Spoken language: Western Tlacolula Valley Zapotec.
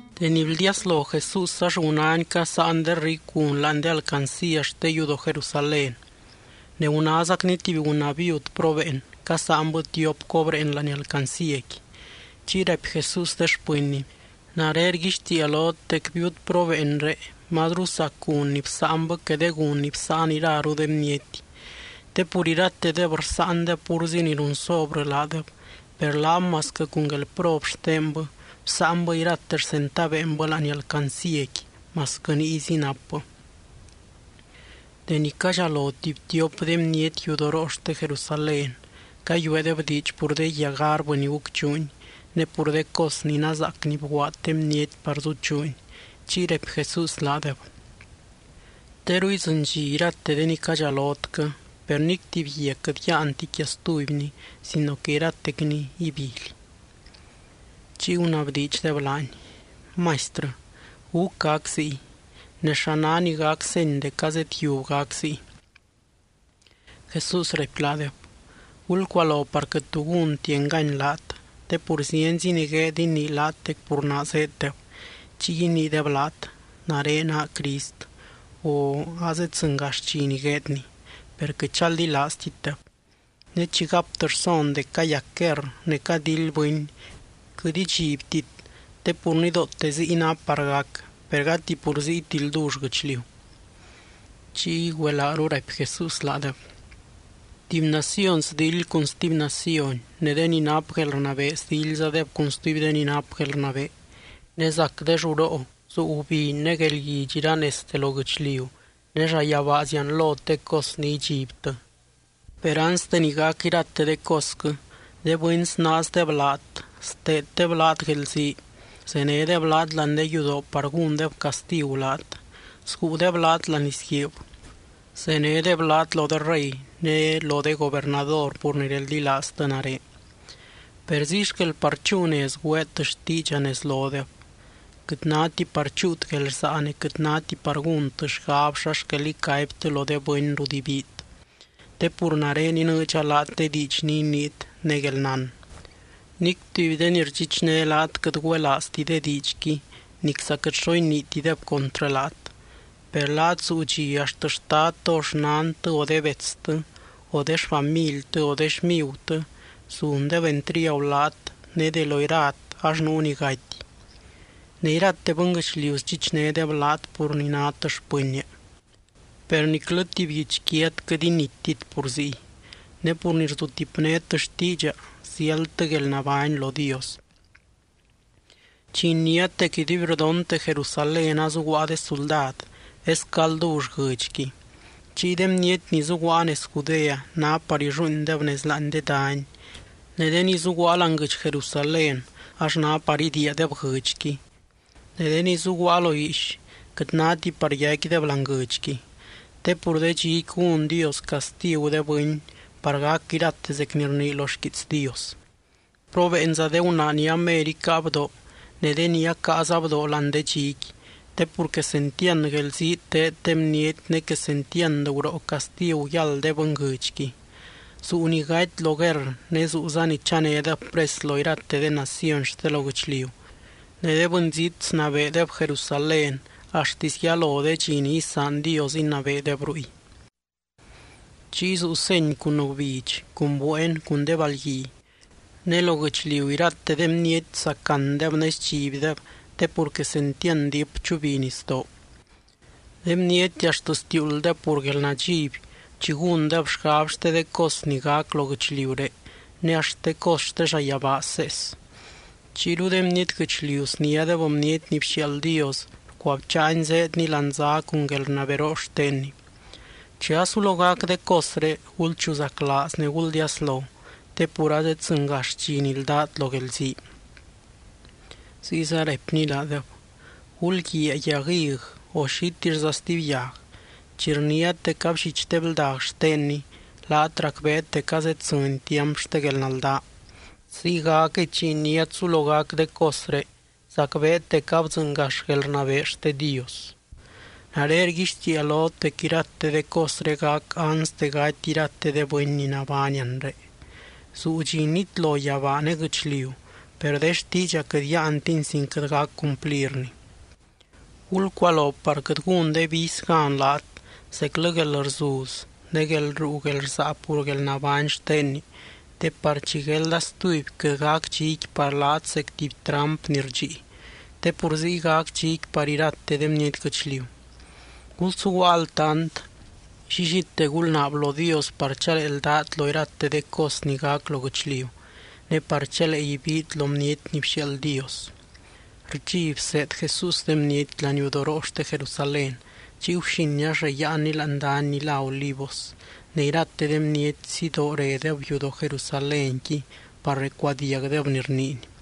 Deni bldiaslo Jesús ax gunány casáan de ricu gun láani de alcancía xte yudoo Jerusalén. Ne gunázacny tuby gunaa viud probeen, casáanbɨ tiop cobreen láani alcancíaqui. Chiy raipy Jesús de xpɨnny: —Nare rguixtiia lot dec viud probeenré mazru sac gun ni bsáanbɨ que de gun ni bsáan iraru de bniety. Te pur iratedeb rsáandeb púrzi ni run sobrɨ laadeb, per laab masquɨ cun guelprob xtenbɨ, bsáanbɨ irate xcentaveenbɨ láani alcancíaqui, masquɨ niyzi napbɨ. Deni cadxalo tuby tiop de bniety yudoroo xte Jerusalén, cayueedeb diidx pur de guia garbɨ ni gucchuuni, ne pur de cos ni nazaac ni bguaad de bniety par zuchuuni. Chiy raipy Jesús laadeb: —Teru idzɨny dxi irate de ni cadxalotquɨ, per nic tuby guia quɨt yáanti quia stubyni sino que iratecni ibily. Chiy gunabdiidxdeb laany: —Maistrɨ, ¿gúc gac ziy? Ne, ¿xa ná ni gac seny dec azedyiub gac ziy? Jesús raipy laadeb: —Gulcualo par quɨt tu gúnti engany laat. Te pur zienzi ni gueed inii laat dec pur naa zéeddeb. Chiy iniideb laat: “Nare naa Crist”, o “Azeddzɨngax dxi ni gueedny.” Per quɨt chaldilaaztitdeb. Ne chi gaptɨ rson dec cayac guerr ne cadildy bɨny, quɨt idxibtit te pur nidoote ziy ná par gac, per gati pur ziyti ldull guɨchliu. Chiy güelaaru raipy Jesús laadeb: —Tuby naciony sdildy cun stuby naciony, ne de ni nap guelrnabee sdildzadeb cun stuby de ni nap guelrnabee. Ne zac de lluroo, zuu gubiny ne guelguidx iranezte lo guɨchliu, ne llayabaa zianlot de cos ni idxibtɨ. ’Per anste ni gac irate de cosquɨ, de bɨny snaazdeb laat steeddeb laat guelzii, zenédeb laat láani de yudoo par gúndeb castigu laat. Sguudeb laat láani lizguiib, zenédeb laat lo de rey ne lo de gobernador pur ni reldilaaztɨ nare. Per ziy xquel par chúu nez güeet xtiidxa nez lodeb. Quɨt náti par chúut guelrsaa ne quɨt náti par gúntɨ xgab xa xquel icaibtɨ lo de bɨny rut ibiit te pur nare inɨɨdxa laat de diidx ni iniit ne guelnán. Nic tuby de ni rdxichné laat quɨt güelaazti de diidxqui nicza quɨt xo iniitideb contrɨ laat. Per laat zuu dxi axt xtadtɨ o xnantɨ, o de betstɨ, o de xfamiltɨ o de xmigutɨ zundeb entriagu laat ne de lo irat ax nuu ni gaty. Ne irate bɨnguɨchliu sdxichnédeb laat pur ni nát xpɨnnia. Per niclɨ tuby guichquiat quɨt inittit pur ziy. Ne pur ni rsutipnét xtiidxa ziáldtɨ guelnabány lo Dios. ’Chi iniát dec iduibrdonte Jerusalén azuguaa de suldad, esquɨ aldull guɨdxqui. Chiy de bniety ni zuguaa nez Judea ná par illuuindeb nez láani de dany, ne de ni zuguaa láani guɨdx Jerusalén ax ná par idiiadeb guɨdxqui, ne de ni zuguaa lo guiix quɨt náti par yaicquideb láani guɨdxqui. Te pur de dxiqui gún Dios castigu de bɨny par gac irate zec ni rnii lo xquiits Dios. ¡Probeenza de gunaa ni amer icáa bdoo ne de ni acaaza bdoo láani de dxiqui! Te pur quesentiand guelzii teed de bniety ne quesentiand guroo castigu yáld de bɨnguɨdxqui. Zuu ni gaty lo guerr, ne zuuza ni chanédeb pres lo irate de naciony xte lo guɨchliu. Ne de bɨnzít snabeedeb Jerusalén, axtisy yalo de dxi ni isaan Dios inabeedeb ruy. ’Chiy zuu seny cun gubidx, cun bueen, cun de balgui. Ne lo guɨchliu irate de bniety sacandeb ne sdxibdeb te pur quesentiand diip chubi nisdoo. De bniety axt stiuulddeb pur guelnadxiby chi gúndeb xgab xte de cos ni gac lo guɨchliuré ne axt de cos xte llayabaa sees. Chiyru de bniety guɨchliu sniádeb Bniety ni bxiaald Dios rcuabcháany zéedny láani zá cun guelrnaberoo xtenny. Chi asulo gac de cosré, gulchuzaclaaz ne guldiaslo, te pur azeddzɨngax dxi ni ldát lo guelzii. Ziyza raipny laadeb: —Gulguiaa yag hig, o xitixza stuby yag. Chi rniát dec abllich de bldag xtenni laat racbeet dec azeddzɨny tiamp xte guelnaldaa. Ziygacquɨy, chi iniát sulo gac de cosré, zacbeet dec abdzɨngax guelrnabee xte Dios. ’Nare rguixtiia lot dec irate de cosré gac anste gaty irate de bɨny ni nabány anre. Zuu dxi nitlo yabaa ne guɨchliu, per de xtiidxa quɨt yáantini sin quɨt gac cumplirni. ’Gulcualo par quɨt gún de vicy gan laat zeclɨ guelrzuz ne guelruu guelrsaa pur guelnabány xtenni te par chi guelda stuby, quɨt gac dxiqui par laat zec tuby tramp ni rdxii, te pur ziy gac dxiqui par irate de bniety guɨchliu. Gulsuguaa altant, llillite gulnaab lo Dios, par chalee ldát lo irate de cos ni gac lo guɨchliu, ne par chalee ibiit lo Bniety ni bxiaald Dios. Rdxi bseed Jesús de bniety laniudoroo xte Jerusalén, chiy guxin ax reyáanny láani dany ni lá Olivos. Ne irate de bniety, sidoo redeb yudoo Jerusalénqui par recuadiagdeb ni rniiny.